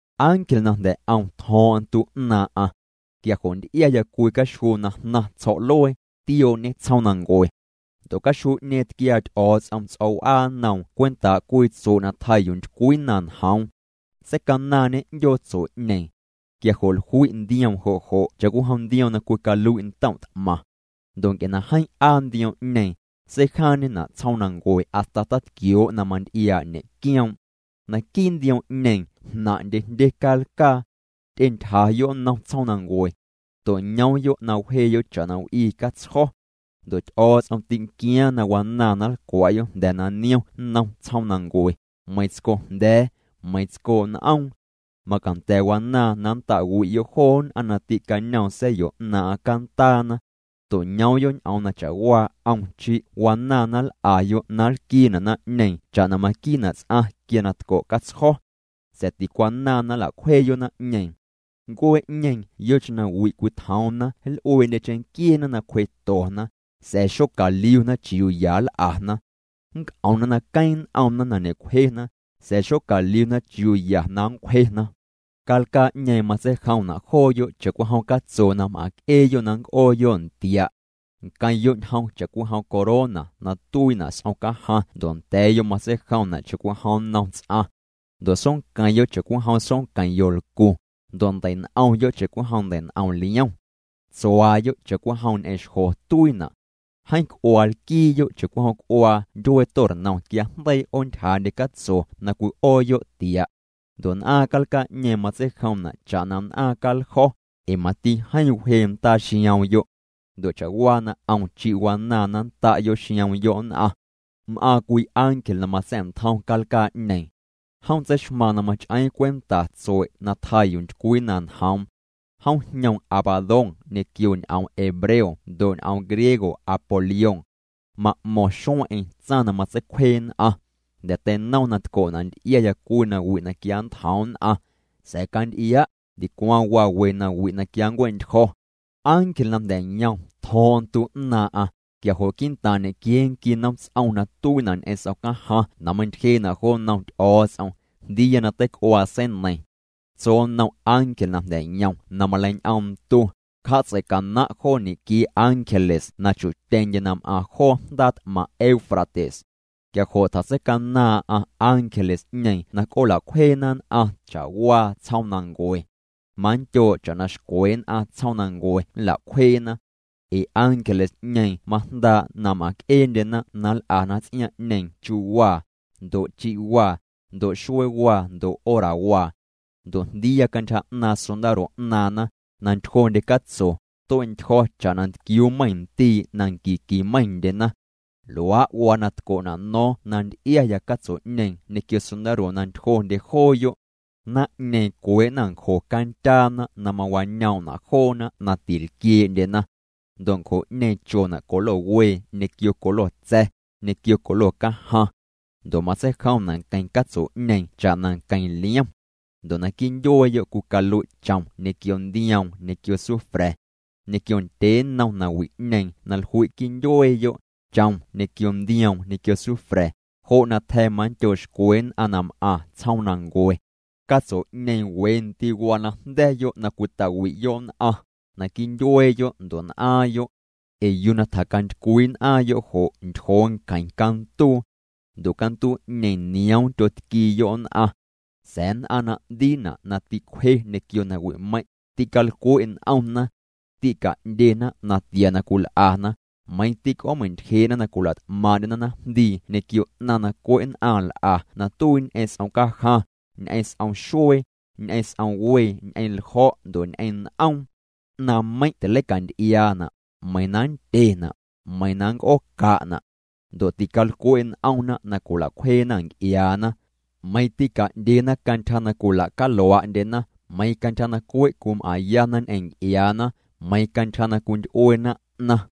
Ángel na jnda̱ 'om tjo̱o̱ⁿ'o̱ⁿ ntu 'naaⁿ'aⁿ. Quia jo' nty'iaya cwii caxjuu na jnaⁿ tsjo̱'luee, tiooñê tsjoomnancue. Ndo' caxjuu'ñeeⁿ tquiaa Ty'o̱o̱ts'om ts'o̱w'aa nnoom cwentaa' cwii tsue' na tjaa yuu ntycwii na njoom. Seicanaaⁿñê 'ndyoo tsue'ñeeⁿ. Quia jo' jlui' ndioom jo' jo' cha'cwijom ndioom na cwicalui' ntom' t'maⁿ. Ndo' nc'e na jeeⁿ 'aa ndioom'ñeeⁿ, seijaaⁿñena' tsjoomnancue hasta tatquioo' na manty'iaa' ñe'quioom'. Naquii' ndioom'ñeeⁿ jnaⁿ'ndye jndye calcaa. Ty'entyjayo' nnom tsjoomnancue. To'ñoomyo' na wjeeyo' cha'na w'ii catsjo̱. Ndo' Ty'o̱o̱ts'om tînquiaaⁿ na wanaaⁿ na nlcwa'yo' jnda̱ na niom nnom tsjoomnancue, meiⁿ tsco jnda̱a̱, meiⁿ tsco n'oom. Macanda̱ wanaaⁿ na nnta'wi'yo' joo nn'aⁿ na tîcañoom sa̱yo 'naaⁿ'aⁿ cantaana. To'ñoomyo' ñ'oom na cha'waa 'om chi' wanaaⁿ na nl'ayo' na nlquiina' naⁿ'ñeeⁿ cha'na maquiina' ts'aⁿ quia na tco' catsjo̱. Sa̱a̱ ticwanaaⁿ na nla'cwjeeyo' naⁿ'ñeeⁿ. Ncuee'ñeeⁿ yocheⁿ na wi' cwitjoomna nl'uee'ndye cheⁿnquieena na cwjetona, sa̱a̱ xocaliuna chiuu ya nl'ana. Nnc'omna na queeⁿ n'omna na ñe'cwjena, sa̱a̱ xocaliuna chiuu ya na nncwjena. Calcaa'ñeeⁿ matseijomna' jooyo' cha'cwijom catso na m'aⁿc'eeyo' na nnc'ooyo' ntia'. Nqueⁿyo' ñjom cha'cwijom corona na tuiina' s'om cajaⁿ ndo' nda̱a̱yo' matseijomna' cha'cwijom nnom ts'aⁿ. Ndo' soonqueⁿyo' cha'cwijom soonqueⁿ yolcu, ndo' ndei'n'omyo' cha'cwijom ndei'n'om liom. Tsuaayo' cha'cwijom ñ'eⁿ xjo tuiina'. Jeeⁿ c'uaa lquiiyo' cha'cwijom c'uaa ndyuee tornom quia na jndeii 'oontyjaandye catso na cwi'ooyo' tia'. Ndo' n'aaⁿ calcaa'ñeeⁿ matseijomna' cha'na n'aaⁿ caljo̱, ee mati jeeⁿ wjee ndaa xioomyo'. Ndo' cha'waa na 'om chi' wanaaⁿ na nnta'yo' xioomyo' nn'aⁿ. M'aaⁿ cwii ángel na matsa̱'ntjoom calcaa'ñeeⁿ. Jom tseixmaaⁿ na mach'eeⁿ cwenta tsue' na tjaa yuu ntycwii na njoom. Jom jñoom Abadón ñequio ñ'oom hebreo ndo' ñ'oom griego Apolión. Ma'mo̱ⁿ xueⁿ'eⁿ tsaⁿ na matseicwjee nn'aⁿ. Jnda̱ teinom na tco'na' nty'iaya cwii nawi' na quia nntjoom nn'aⁿ. Sa̱a̱ canty'ia', ndicwaⁿ waa we nawi' na quia nncue'ntyjo̱. Ángel na jnda̱ yom tjo̱o̱ⁿ'o̱ⁿ ntu 'naaⁿ'aⁿ, quia jo' quii'ntaaⁿ ñequiee nqui nomts'om na tuiina' ñ'eⁿ s'om cajaⁿ na meiⁿntyjee'na' jo nnom Ty'o̱o̱ts'om, jndiiya na teic'uaa seineiⁿ. Tso nnom ángel na jnda̱ yom na maleiñ'oom ntu: —Cja'tseicanaⁿ' joo ñequiee ángeles na chu'tyeⁿndye na m'aⁿ joo jndaa t'maⁿ Eufrates. Quia jo' tjatseicanaaⁿ'aⁿ ángeles'ñeeⁿ na c'oola'cwjeena nn'aⁿ cha'waa tsjoomnancue. Manndyoo' cha'na xcwe nn'aⁿ tsjoomnancue nla'cwjeena. Ee ángeles'ñeeⁿ majndaa' na m'aⁿc'eendyena na nl'ana ts'iaaⁿ'ñeeⁿ chuwaa, ndo' chi'waa, ndo' xueewaa, ndo' horawaa. Ndo' jndiiya cantyja 'naaⁿ sondaro 'naaⁿna, na ntyjondye catso, tue'ntyjo̱ cha'na ntquiuu meiⁿ ndii' na nqui nqui meiⁿndyena. Luaa' waa na tco'na' no̱o̱ⁿ na nty'iaya catso'ñeeⁿ ñequio sondaro na ntyjondye jooyo'. Naⁿ'ñeeⁿ cwee'na ncjo candyaana na mawañoom'na' joona na tilquiee'ndyena. Ndo' ncjo'ñeeⁿ chona' colo wee ñequio colo tsa̱, ñequio colo cajaⁿ. Ndo' matseijomna' nqueⁿ catso'ñeeⁿ cha'na nqueⁿ liom. Ndo' naquii' ndyueeyo' cwicalui' chom ñequio ndioom ñequio sufra̱. Ñequio ndyee nnom nawi'ñeeⁿ na jlui' quii' ndyueeyo', chom ñequio ndioom ñequio sufra̱, jo' na tja̱ manndyoo' xcwe nn'aⁿ na m'aⁿ tsjoomnancue. Catso'ñeeⁿ we ndii' waa na jnda̱yo' na cwita'wi'yo' nn'aⁿ, naquii' ndyueeyo' ndo' n'aaⁿyo'. Ee yuu na tjacantycwii n'aaⁿyo' jo' ntyjoo nqueⁿ canduu. Ndo' canduu'ñeeⁿ nioom tyotquiiyo' nn'aⁿ. Sa̱a̱ nn'aⁿ na 'ndiina' na tîcwje ñequio nawi'meiⁿ', tîcalcwe' n'omna. Tîca'ndyena natia na cwil'ana, meiⁿ tîc'oomeintyjee'na na cwila't'maaⁿ'ndyena naⁿjndii ñequio 'naⁿ na cwe' nn'aⁿ nl'a na tuii ñ'eⁿ s'om cajaⁿ, ñ'eⁿ s'om xuee, ñ'eⁿ s'om wee, ñ'eⁿ ljo̱', ndo' ñ'eⁿ n'oom. 'Naⁿmeiⁿ' tilei'canty'iaana', meiⁿ na nndyena', nmeiⁿ na nnc'ooca'na'. Ndo' tîcalcwe' n'omna na cwila'cwjeena nc'iaana. Meiⁿ tîca'ndyena cantyja na cwila'calua'ndyena, meiⁿ cantyja na cwe' cwim'aⁿyana ñ'eⁿ nc'iaana, meiⁿ cantyja na cwinty'ueena 'naⁿ.